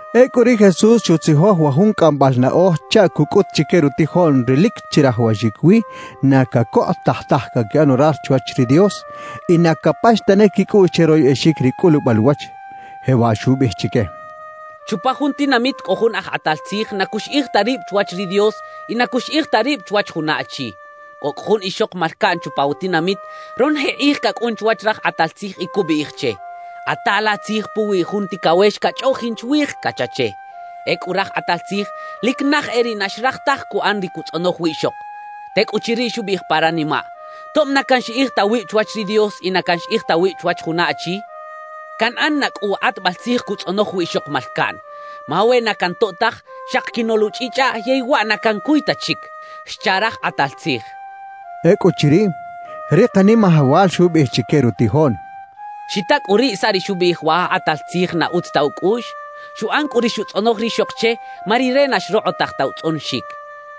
Ecꞌu ri Jesús xutzijoj wa jun cꞌambal naꞌoj chaꞌ cucꞌut chique rutijoꞌn ri lic chirajawaxic wi na cacokꞌotaj taj caquiꞌan orar chwach ri Dios y na capax tane quicꞌuꞌx che royꞌexic ri cꞌulubal uwach. Jewaꞌ xubiꞌij chique: «Chupa jun tinamit cꞌo jun aj kꞌatal tzij na cuxiꞌij ta rib chwach ri Dios y na cuxiꞌij ta rib chwach juna achi. Cꞌo cꞌu jun ixok malcaꞌn chupa wa tinamit, ronoje kꞌij cacꞌun chwach raj kꞌatal tzij y cubiꞌij che: “Kꞌata la tzij puwi jun ticawex cachꞌoꞌjin chwij” cacha che. »Ecꞌu raj kꞌatal tzij lic naj e riꞌ na xraj taj cuꞌan ri cutzꞌonoj wiꞌxok. Tecꞌuchiriꞌ, xubiꞌij pa ranimaꞌ: “Tob na canxiꞌij ta wib chwach ri Dios y na canxiꞌij ta wib chwach juna achi, canꞌan na cꞌu wa kꞌatbal tzij cutzꞌonoj wiꞌxok malcaꞌn. Ma we na cantoꞌ taj, xaki quinoꞌluchꞌichꞌaꞌ yey waꞌ na cancuy ta chic” xcha raj kꞌatal tzij.» Ecꞌuchiriꞌ, ri Kanimajawal xubiꞌij chique rutijoꞌn: «Xita cꞌu riꞌ saꞌ ri xubiꞌij wa aj kꞌatal tzij na utz ta ucꞌuꞌx. Xuꞌan cꞌu ri xutzꞌonoj rixok che ma rire na xrokꞌotaj ta utzꞌonoxic.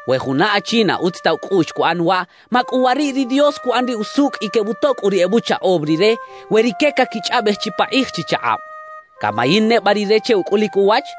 »We juna achi na utz ta ucꞌuꞌx cuꞌan waꞌ, ¡macꞌuwariꞌ ri Dios cuꞌan ri usucꞌ y quebutoꞌ cꞌu ri ebuchaꞌom Rire we rique caquichꞌaꞌbej chipakꞌij chichakꞌab! ¿Camayin neba Rire che ucꞌulic uwach?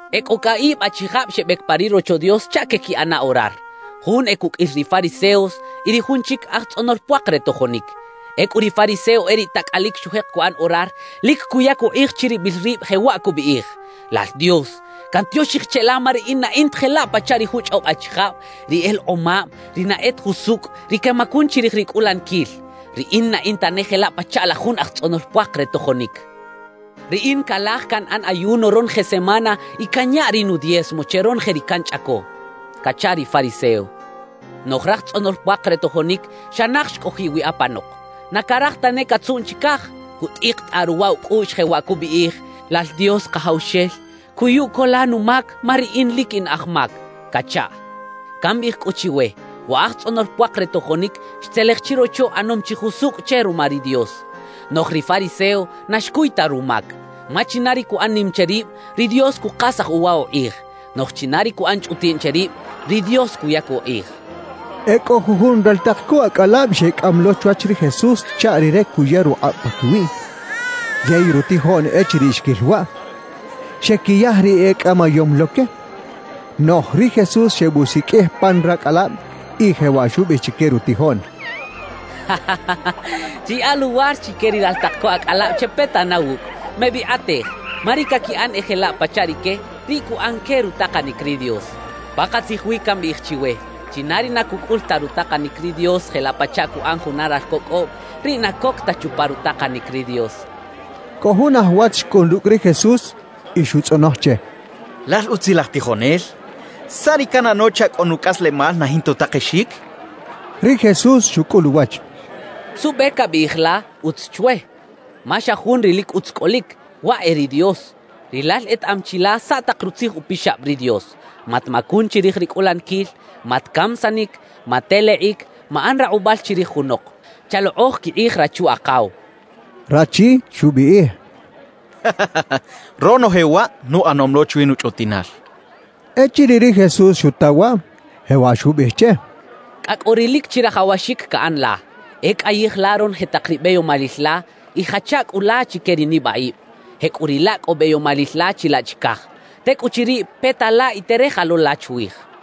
«E cꞌo caꞌib achijab xebec pa ri Rocho Dios chaꞌ queꞌquiꞌana orar; jun e cuqꞌuil ri fariseos y ri jun chic, aj tzꞌonol puak re tojonic. Ecꞌu ri fariseo e riꞌ tacꞌalic xujek cuꞌan orar; lic cuyac ukꞌij chiribil rib, jewaꞌ cubiꞌij: “Lal Dios, cantioxij cheꞌla ma riꞌin na in ta jelaꞌ pachaꞌ ri juchꞌob achijab: ri elekꞌomab, ri na e ta jusucꞌ, ri quemacun chirij ri cꞌulaniquil. Riꞌin na in tane jelaꞌ pachaꞌ la jun aj tzꞌonol puak re tojonic. Riꞌin calaj canꞌan ayuno ronoje semana, y canya ri nudiezmo che ronoje ri canchꞌaco” cacha ri fariseo. »Noꞌj raj tzꞌonol puak re tojonic xa naj xcꞌojiꞌ wi apanok. Na caraj tane catzuꞌn chicaj; cutꞌikitꞌaꞌ ruwa ucꞌuꞌx, jewaꞌ cubiꞌij: “Lal Dios Kajawxel, ¡cuyu co la numac, ma riꞌin lic in aj mac!” cachaꞌ. »Cambiꞌij cꞌu chiwe: Wa aj tzꞌonol puak re tojonic xtzelej chirocho ꞌanom chi jusucꞌ che ruma ri Dios; noꞌj ri fariseo, na xcuy ta rumac. Ma china ri cuꞌan nim che rib, ri Dios cukasaj uwa ukꞌij; noꞌj china ri cuꞌan chꞌutiꞌn che rib, ri Dios cuyac ukꞌij» xchaꞌ. E cꞌo jujun raltak co acꞌalab xecꞌam lo chwach ri Jesús chaꞌ Rire cuya rukꞌab paquiwiꞌ. Yey rutijoꞌn echiriꞌ xquil waꞌ, xequiyaj ri ecꞌamayom lo que. Noꞌj ri Jesús xebusiqꞌuij pan racꞌalab y jewaꞌ xubiꞌij chique rutijoꞌn: «Chiyaꞌa luwar chique ri raltak co acꞌalab chepeta na wucꞌ. Mebikꞌatej; ma ri caquiꞌan e jelaꞌ pachaꞌ rique, riꞌ cuꞌan que rutakanic ri Dios. Pakatzij wi cambiꞌij chiwe: China ri na cucꞌul ta rutakanic ri Dios jelaꞌ pachaꞌ cuꞌan juna ralco cꞌoꞌm, riꞌ na coc ta chupa rutakanic ri Dios» xchaꞌ. Cꞌo jun aj wach xcꞌun rucꞌ ri Jesús y xutzꞌonoj che: —Lal utzilaj tijonel, ¿saꞌ ri canꞌano chaꞌ cꞌo nucꞌaslemal na jinta utakexic? —xchaꞌ. Ri Jesús xucꞌul uwach: —¿Suꞌbe cabiꞌij la “utz” chwe? Ma xa Jun ri lic utz cꞌolic, waꞌ e ri Dios. Rilal etaꞌam chi la saꞌ tak Rutzij Upixab ri Dios: “Matmacun chirij ri cꞌulaniquil. Matcamisanic. Matelekꞌic. Maꞌan rakꞌubal chirij junok. Chalokꞌoj quikꞌij rachu-akaw” —xcha che. Rachi xubiꞌij: —Ronoje waꞌ nuꞌanom lo chwi nuchꞌutiꞌnal —xchaꞌ. Echiriꞌ ri Jesús xuta waꞌ, jewaꞌ xubiꞌij che: —Cꞌa cꞌo ri lic chirajawaxic caꞌan la: E cꞌayij la ronoje tak ri beyomalil la y jacha cꞌu la chique ri nibaꞌib; jecꞌuriꞌlaꞌ cꞌo beyomalil la chilaꞌ chicaj. Tecꞌuchiriꞌ peta la y tereja lo la chwij —xchaꞌ.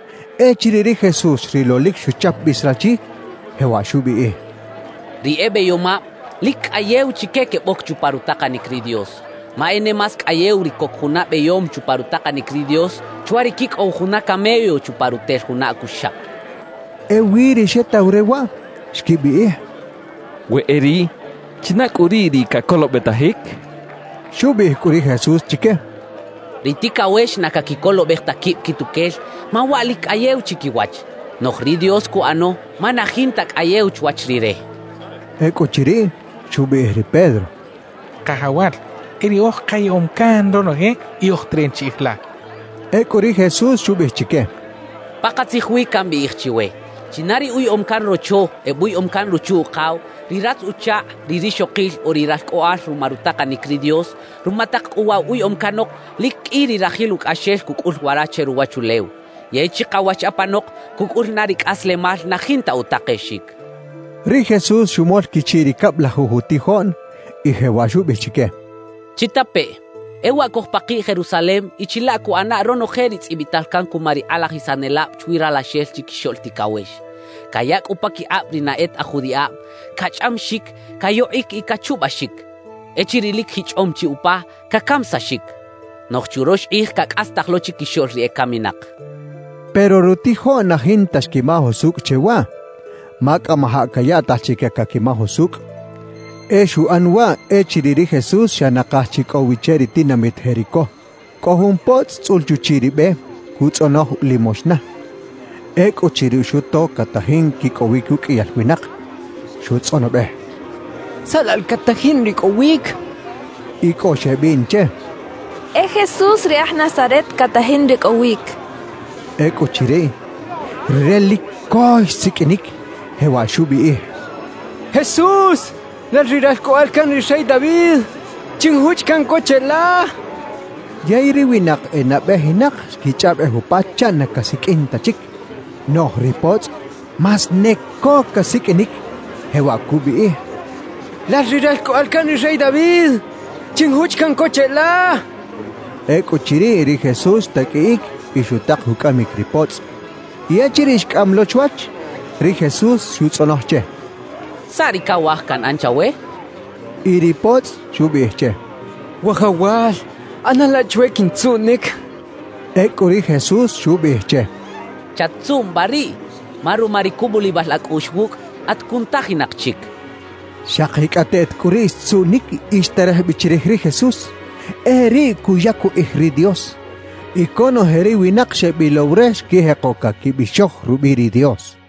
Echiriꞌ ri Jesús xrilo lic xuchap bis rachi, jewaꞌ xubiꞌij: —Ri e beyomab, lic cꞌayew chique queboc chupa rutakanic ri Dios. Ma e ne más cꞌayew ri coc juna beyom chupa rutakanic ri Dios chwa ri quicꞌow juna camello chupa rutel juna acuxaꞌ —xchaꞌ. Ewi ri xetaw re waꞌ, xquibiꞌij: —We e riꞌ, ¿china cꞌu riꞌ ri cacolobetajic? —xechaꞌ. Xubiꞌij cꞌu ri Jesús chique: —Ri ticawex na caquicolobej ta quib quituquel, ma waꞌ lic cꞌayew chiquiwach; noꞌj ri Dios cuꞌano ma na jinta cꞌayew chwach Rire —xchaꞌ. Ecꞌuchiriꞌ, xubiꞌij ri Pedro: —Kajawal, e riꞌoj kayaꞌom can ronoje y oj teran chiꞌij la —xchaꞌ. Ecꞌu ri Jesús xubiꞌij chique: —Pakatzij wi cambiꞌij chiwe: China ri uyaꞌom can rocho, ebuyaꞌom can ruchu-ukaw, ri ratz-uchakꞌ, ri rixokil o ri ralcꞌoꞌal ruma rutakanic ri Dios; ruma tak cꞌu waꞌ wa uyaꞌom canok, lic qꞌui ri rajil ucꞌaxel cucꞌul wara che ruwachulew. Yey chikawach apanok cucꞌul na ri cꞌaslemal na jinta utakexic —xchaꞌ. Ri Jesús xumol quichiꞌ ri cablajuj utijoꞌn y jewaꞌ xubiꞌij chique: «Chitapeꞌ. E waꞌ cojpakiꞌ Jerusalem y chilaꞌ cuꞌana ronoje ri tzꞌibital can cuma ri kꞌalajisanelab chwi Ralaxel Chiquixoꞌl Ticawex: cayaꞌ cꞌu paquikꞌab ri na e ta aj judiꞌab, cachꞌamixic, cayokꞌic y cachubaxic. Echiriꞌ lic jichꞌom chi upa, cacamisaxic. Noꞌj churox kꞌij cacꞌastaj lo chiquixoꞌl ri ecaminak» xcha ri Jesús. Pero rutijoꞌn na jinta xquimaj usucꞌ che waꞌ, ma cꞌamajaꞌ cayaꞌtaj chique caquimaj usucꞌ. E xuꞌan waꞌ echiriꞌ ri Jesús xa nakaj chi cꞌo wi che ri tinamit Jericó. Cꞌo jun potzꞌ tzꞌul chuchiꞌ ri be, cutzꞌonoj limoxna. Ecꞌuchiriꞌ xuto catajin quicꞌowic uqꞌuiyal winak, xutzꞌonobej: —¿Saꞌ laꞌ la catajin ricꞌowic? —xchaꞌ. Y cꞌo xebiꞌn che: —E Jesús ri aj Nazaret catajin ricꞌowic —xechaꞌ. Ecꞌuchiriꞌ, rire lic co xsiqꞌuinic, jewaꞌ xubiꞌij: —¡Jesús, lal ri Ralcꞌoꞌal can ri rey David, chinjuchꞌ caꞌn co cheꞌla! —xchaꞌ. Yey ri winak e nabejinak xquichꞌaꞌbej upa chaꞌ na casiqꞌuin ta chic. Noꞌj ri potzꞌ más ne co casiqꞌuinic, jewaꞌ cubiꞌij: —¡Lal ri Ralcꞌoꞌal can ri rey David, chinjuchꞌ caꞌn co cheꞌla! —xchaꞌ. Ecꞌuchiriꞌ ri Jesús xtaqꞌuiꞌic y xutak ucꞌamic ri potzꞌ. Y echiriꞌ xcꞌam lo chwach, ri Jesús xutzꞌonoj che: —¿Saꞌ ri cawaj canꞌan chawe? —xchaꞌ. Y ri potzꞌ xubiꞌij che: —Wajawal, ꞌana la chwe quintzuꞌnic —xchaꞌ. Ecꞌu ri Jesús xubiꞌij che: —¡Chat-tzuꞌn ba riꞌ! Ma ruma ri cubulibal acꞌuꞌx wucꞌ, at cunutajinak chic —xchaꞌ. Xakicꞌateꞌt cꞌu riꞌ xtzuꞌnic y xterej bi chirij ri Jesús, e riꞌ cuyac ukꞌij ri Dios. Y conoje ri winak xebilow re xquijeko caquibixoj rubiꞌ ri Dios.